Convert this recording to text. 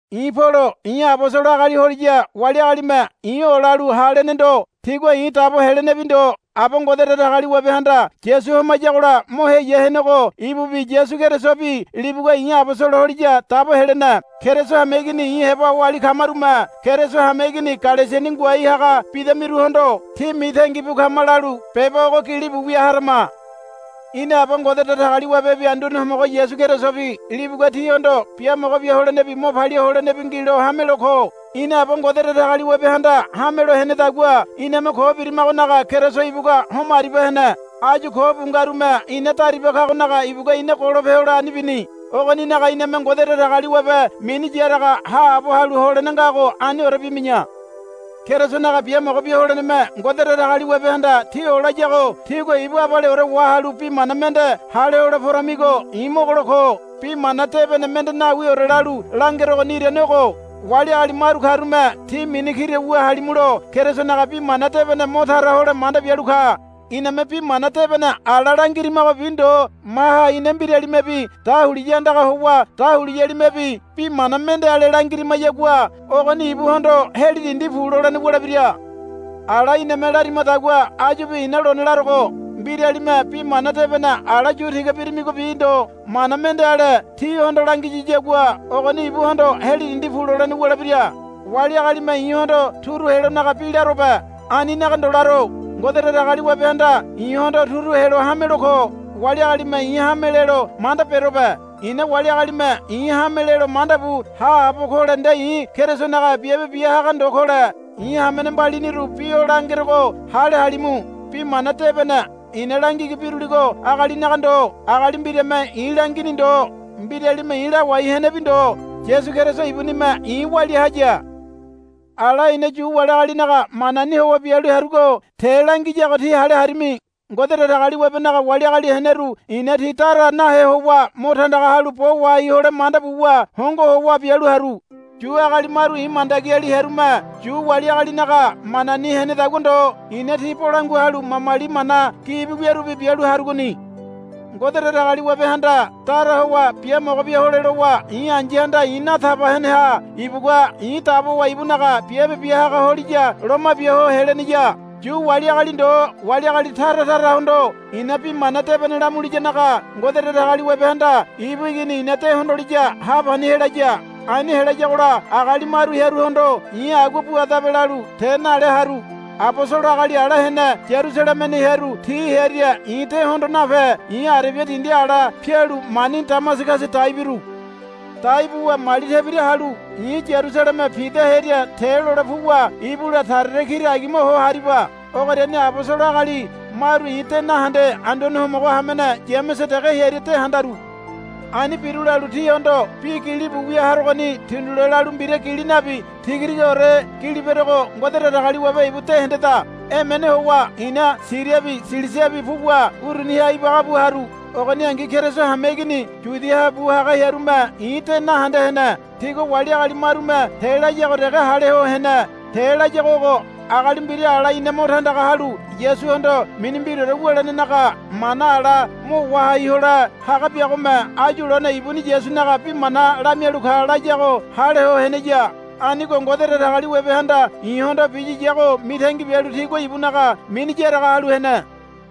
I̱ Polo. I̱ abosolo agali holiya wali agalime i̱ olalu, Ha, lene ndo. Tigua i̱ dabo helenebi ndo. Aba Ngode Datagaliwabehanda Yasu homayagola mo heya henego ibubi Yasu Kerisobi libugua i̱ abosolo holiya dabo helene. Keriso hameigini i̱ heba oali kamarume Keriso hameigini Galesiani ngoai haga bidamiruhondo, Tí mitangi bu kama, lalu beba ogo gilibu wia harama. Ina Aba Ngode Datagaliwabebi Anduane Homogo Yasu Kerisobi libugua tíhondo biamogo bia holenebi mo palia holenebi ngilo hamelo ko. Ina Aba Ngode Datagaliwabehanda hamelo henedagua iname ko birimagonaga Keriso ibugua homo aribia hene. Áyu ko bu ngarume ina dariba kagonaga ibugua ina golope hole ani bini. Ogoninaga iname Ngode Datagaliwabe mini yaraga haabo halu holene ngago aniore bimi̱ya. Kerisonaga biamogo bia holeneme Ngode Datagaliwabehanda tí olayago tígua ibu abaleore wahalu bi mana mende hale hole poramigo i̱ mogolo ko. Bi Mana Debene mende nawiore lalu langerogoni irane ogo. Wali agali maru karume tí mini kira wu halimulo Kerisonaga Bi Mana Debene mo tara hole manda bialu ka. Iname Bi Mana Debene ala langirimagobi ndo maha ina mbiralimebi dahuliya andaga howa dahuliyalimebi bi mana mende ale langirimayagua ogoni ibuhondo, Heli dindi pu, lolene wulebira. Ala iname larimadagua áyubi i̱na lone larogo. Mbiralime Bi Mana Debene ala yu tiga birimigobi ndo mana mende ale tíhondo langiyiyagua ogoni ibuhondo, Heli dindi pu, lolene wulebira. Wali agalime i̱hondo turu helonaga bi larobe. Aninaga ndo laro. Ngode Datagaliwabehanda i̱hondo turu helo hamelo ko. Wali agalime i̱ hame lelo manda berobe. I̱na wali agalime i̱ hame lelo manda bu haabo kole nde i̱ Kerisonaga biabe bia haga ndo kole. I̱ hamene mbaliniru bi o langerogo hale halimu. Bi Mana Debene i̱na langigi biruligo agalinaga ndo. Agali mbirame i̱ langini ndo. Mbiralime i̱ lawai henebi ndo. Yasu Keriso ibunime i̱ walia haya. Ala i̱na Yu wali agalinaga manani howa bialu harugo te langiyago tí hale harimi. Ngode Datagaliwabenaga wali agali heneru i̱na ti dara nahe howa mo tandaga halu bo wahai hole manda buwa hongo howa bialu haru. Yu agali maru i̱ mandagiali hearume Yu wali agalinaga manani henedagua ndo i̱na ti bolangua halu mamali mana gibi wiarubi bialu harugoni. Ngode Datagaliwabehanda dara howa biamogo bia hole lowa i̱ ai̱yahanda i̱ nataba heneha ibugua i̱ dabowa ibunaga biabe bia haga holiya loma bia ho heleneya. Yu wali agali ndo wali agali tara tarahondo i̱na Bi Mana Debene lamuliyanaga Ngode Datagaliwabehanda ibu Igini i̱na de hondoliya ha pani helaya. Ani helayagola agali maru hearuhondo i̱ agua buadabe lalu te nale haru. Abosolo agali ala hene Yarusalemeni hearu ti hearia i̱ de hondo nape i̱ Arebia dindi ala pialu mani Damasagasa dai biru. Dai buwa mali tebira halu i̱ Yarusaleme Pida hearia te lole puwa ibula Sarere kira agima ho hariba. Ogoriani abosolo agali maru i̱ de nahende Anduane Homogo hamene Yamese dege hearia de handaru. Ani biru lalu tíhondo bi gilibu wia harogoni tindule lalu mbira gili nabi tigatigaore gili berogo Ngode Datagaliwabe ibu de hendeda. Emene howa i̱na Siriabi Silisiabi puwa uruniha ibaga bu haru. Ogoningi Keriso hameigini Yudiaha bu haga hearume i̱ de nahende hene. Tigua wali agali marume te layago dege hale ho hene. Te layago ogo. Agali mbira ala ina mo tandaga halu Yasuhondo mini mbiraore wulenenaga mana ala mo wahai hole haga biagome áyu lone ibuni Yasunaga bi mana lamialu ka, layago hale ho heneya. Anigo Ngode Datagaliwabehanda i̱hondo biyiyago mitangi bialu tigua ibunaga mini yaraga halu hene.